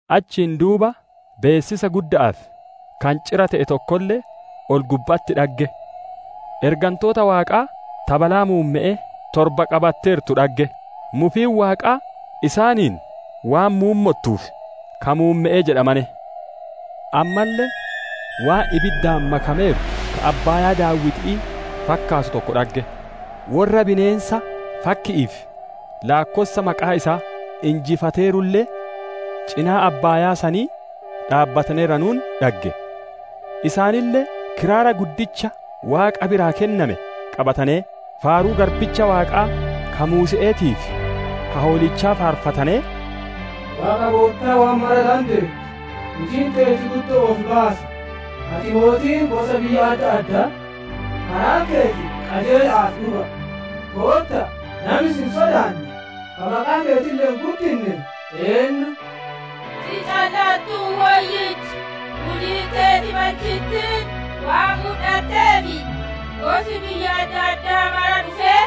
Achiin duuba beessisa gudda'aa fi kancira te'e tokkolle ol-gubba'atti dhagge. Ergantoota Waaqaa ta balaa muumme'ee torba qabatteertu dhagge; mufiin Waaqaa isaaniin waan muummottuuf, ka muumme'ee jedhamane. Ammalle waan ibiddaan makameeru ka abbaayaa daaw'iti'ii fakkaatu tokko dhagge; worra bineensa, fakki'ii fi laakkossa maqaa isaa injifateerulle, cinaa abbaayaa sanii dhaabbataneeranuun dhagge. Isaanille kiraara guddicha Waaqa biraa kenname qabatanee, faaruu garbicha Waaqaa ka Muuse'eetii fi Ka Hoolichaa faarfatanee, «Waaqa Goottaa waan mara dandeettu, hujiin teeti guddo'oo fi baasa! Ati mootii gosa biyya adda addaa, karaan keeti qajeela'aa fi dhuga'a! Gootta'a! Nami si hin sodaanne, ka maqaa keetille hin guddinne eennu? Si calla'attuu woyyicha; hujiin teeti balchittiin waan mudhatteef, gosi biyya adda addaa mara dhufee,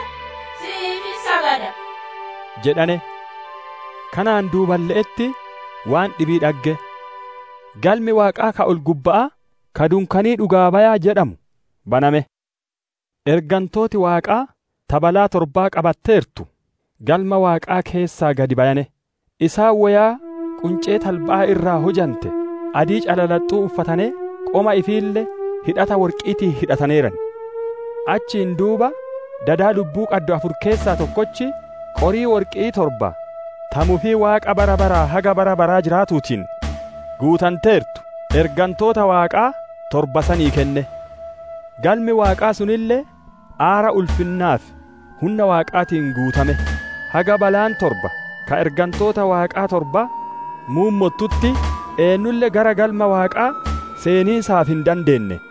si'iif hin sagada» jedhane. Kanaan duuballe'etti waan dhibii dhagge. Galmi Waaqaa ka ol-gubba'aa, ka dunkaanii dhugaa bayaa jedhamu baname; ergantooti Waaqaa ta balaa torba qabatteertu, Galma Waaqaa keessaa gadi bayane; isaan woyaa quncee talba'aa irraa hujante, adii calalaxxu uffatanee qoma ifiille hidhata worqi'iitiin hidhataneeran. Achiin duuba dada lubbuu qaddu afur keessaa tokkochi, qorii worqi'ii torba ta mufii Waaqa bara baraa haga bara baraa jiraatuutiin guutanteertu, ergantoota Waaqaa torba sanii kenne. Galmi Waaqaa sunille aara ulfinnaa fi hunna Waaqaatiin guutame; haga balaan torba ka ergantoota Waaqaa torbaa muummottutti, eennulle gara Galma Waaqaa seeniisaaf hin dandeenne.